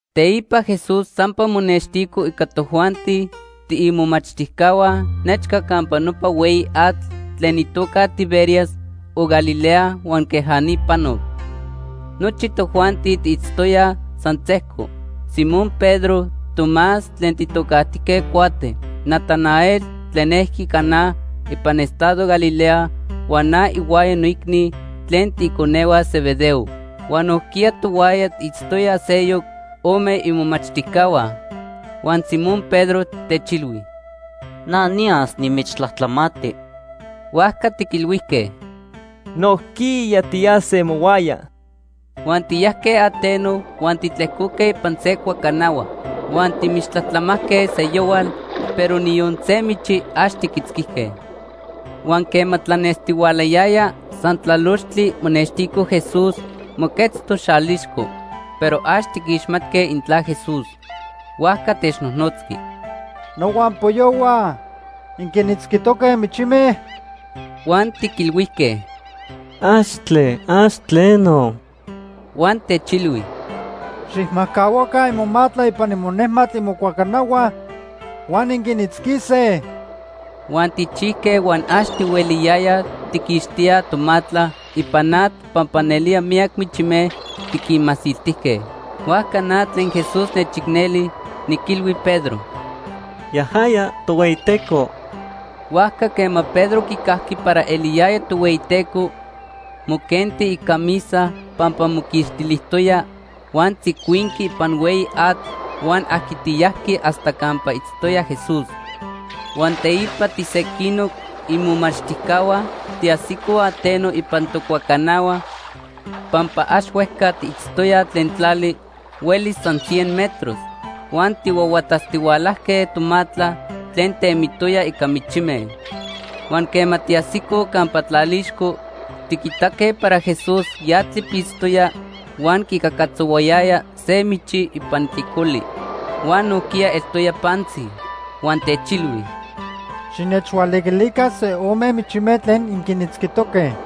Teipa Jesús sampa monextico ica tojuanti tiimomachtijcahua nechca campa nopa hueyi atl tlen itoca Tiberias o Galilea huan queja ni panoc. Nochi tojuanti tiitztoyaj san sejco: Simón Pedro, Tomás tlen tijtocajtijque Cuate, Natanael tlen ejqui Caná ipan estado Galilea huan na ihuaya noicni tlen tiiconehua Zebedeo. Huan nojquiya tohuaya itztoyaj seyoc ome imomachtijcahua. Huan Simón Pedro techilhui: ―Na niyas nimichtlajtlamati. Huajca tiquilhuijque: ―Nojquiya tiyase mohuaya. Huan tiyajque ateno huan titlejcoque ipan se cuacanahua. Huan timichtlajtlamajque seyohual, pero niyon se michi ax tiquitzquijque. Huan quema tlanestihualayaya, san tlalochtli monextico Jesús, moquetztoc xalixco, pero ax tiquixmatque intla Jesús. Huajca technojnotzqui: ―Nohuampoyohua, ¿inquinitzquitoque michime? Huan tiquilhuijque: ―Axtle, ax tleno. Huan techilhui: ―Xijmajcahuaca imomatla ipan inejmatl imocuacanahua huan inquinitzquise. Huan tijchijque huan ax tihueliyayaj tijquixtíaj tomatla ipan atl pampa nelía miyac michime tiquinmasiltijque. Huajca na tlen Jesús nechicneli niquilhui Pedro: “Yajaya Tohueyiteco.” Huajca quema Pedro quicajqui para eliyaya Tohueyiteco, moquenti icamisa pampa moquixtilijtoya, huan tzicuinqui ipan hueyi atl huan ajquitiyajqui hasta campa itztoya Jesús. Huan teipa tisequinoc imomachtijcahua tiajsicoj ateno ipan tocuacanahua pampa ax huejca tiitztoyaj tlen tlali, huelis san cien metros. Huan tijhuahuatatztihualajque tomatla tlen temitoya ica michime. Huan quema tiajsicoj campa tlalixco, tiquitaque para Jesús ya tlipitztoya huan quicacatzohuayaya se michi ipan tlicoli. Huan nojquiya eltoya pantzi. Huan techilhui: ―Xinechhualiquilica se ome michime tlen inquinitzquijque.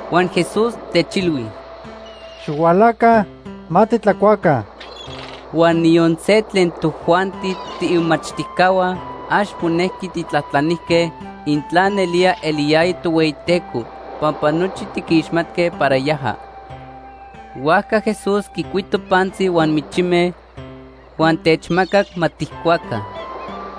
Huan Jesús techilhui: ―Xihualaca, ma titlacuaca. Huan niyon se tlen tojuanti tiimomachtijcahua ax monejqui tijtlajtlanijque intla nelía eliyaya Tohueyiteco pampa nochi tiquixmatque para yaja. Huajca Jesús quicuito pantzi huan michime, huan techmacac ma tijcuaca.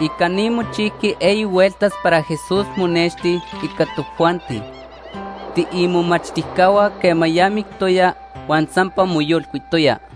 Ica ni mochijqui eyi hueltas para Jesús monexti ica tojuanti tiimomachtijcahua quema ya mictoya huan sampa moyolcuitoya.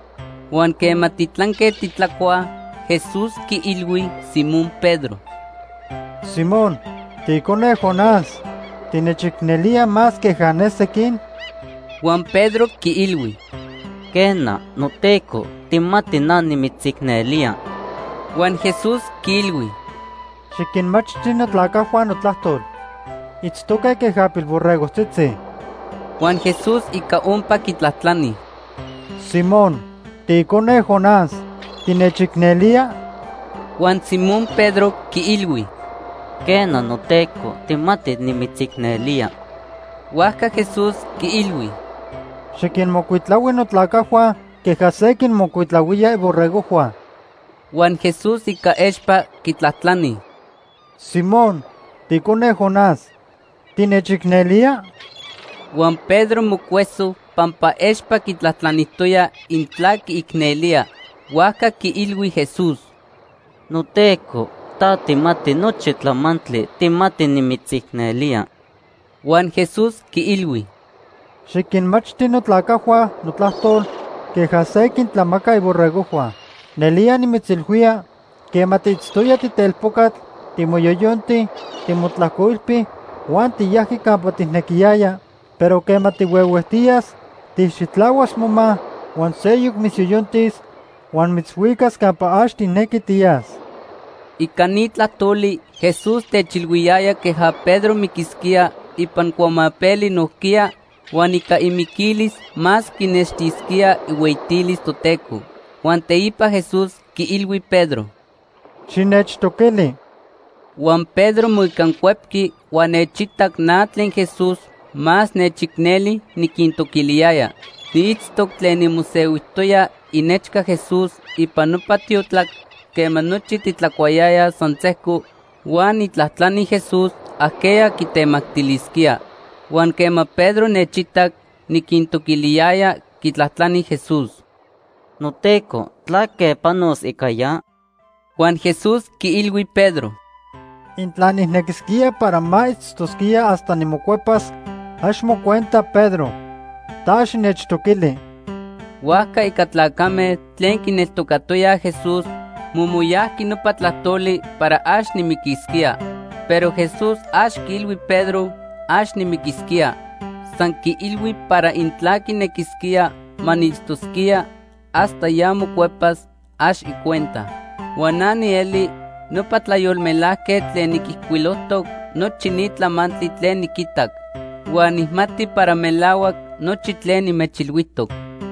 Huan quema titlanque titlacuaj, Jesús quiilhui Simón Pedro: ―Simón, tiicone Jonás, ¿tinechicnelía más queja ne sequin? Huan Pedro quiilhui: ―Quena, noTeco, tijmati na nimitzicnelía. Huan Jesús quiilhui: ―Xiquinmachti notlacajhua notlajtol. Itztoque queja pilborregojtzitzi. Huan Jesús ica ompa quitlajtlani: ―Simón, tiicone Jonás, ¿tinechicnelía? Huan Simón Pedro quiilhui: Quena, noTeco, tijmati nimitzicnelía. Huajca Jesús quiilhui: ―Xiquinmocuitlahui notlacajhua queja se quinmocuitlahuía iborregojhua. Huan Jesús ica expa quitlajtlani: ―Simón, tiicone Jonás, ¿tinechicnelía? Huan Pedro mocueso pampa expa quitlajtlanijtoya intla quiicnelía. Huajca quiilhui Jesús: ―NoTeco, ta tijmati nochi tlamantli. Tijmati nimitzicnelía. Huan Jesús quiilhui: ―Xiquinmachti notlacajhua notlajtol queja se quintlamaca iborregojhua. Nelía nimitzilhuía, quema tiitztoya titelpocatl, timoyoyonti, timotlajcoilpi huan tiyajqui campa tijnequiyaya, pero quema tihuehuejtiyas, tijxitlahuas moma huan seyoc mitzyoyontis huan mitzhuicas campa ax tijnequi tiyas. Ica ni tlajtoli, Jesús techilhuiyaya queja Pedro miquisquía ipan cuamapeli nojquiya, huan ica imiquilis más quinextisquía ihueyitilis Toteco. Huan teipa Jesús quiilhui Pedro: ―¡Xinechtoquili! Huan Pedro moicancuepqui huan nechitac na tlen Jesús más nechicneli niquintoquiliyaya. Niitztoc tlen nimosehuijtoya inechca Jesús ipan nopa tiotlac quema nochi titlacuayayaj san sejco huan nijtlajtlani Jesús ajqueya quitemactilisquía. Huan quema Pedro nechitac niquintoquiliyaya, quitlajtlani Jesús: ―NoTeco, ¿tlaque panos ica ya? Huan Jesús quiilhui Pedro: ―Intla nijnequisquía para ma itztosquía hasta nimocuepas, ax mocuenta Pedro. Ta xinechtoquili. Huajca ica tlacame tlen quineltocatoyaj Jesús momoyajqui nopa tlajtoli para ax nimiquisquía. Pero Jesús ax quiilhui Pedro ax nimiquisquía. San quiilhui para intla quinequisquía ma niitztosquía hasta ya mocuepas, ax icuenta. Huan na nieli nopa tlayolmelajquetl tlen niquijcuilojtoc nochi ni tlamantli tlen niquitac. Huan nijmati para melahuac nochi tlen nimechilhuijtoc.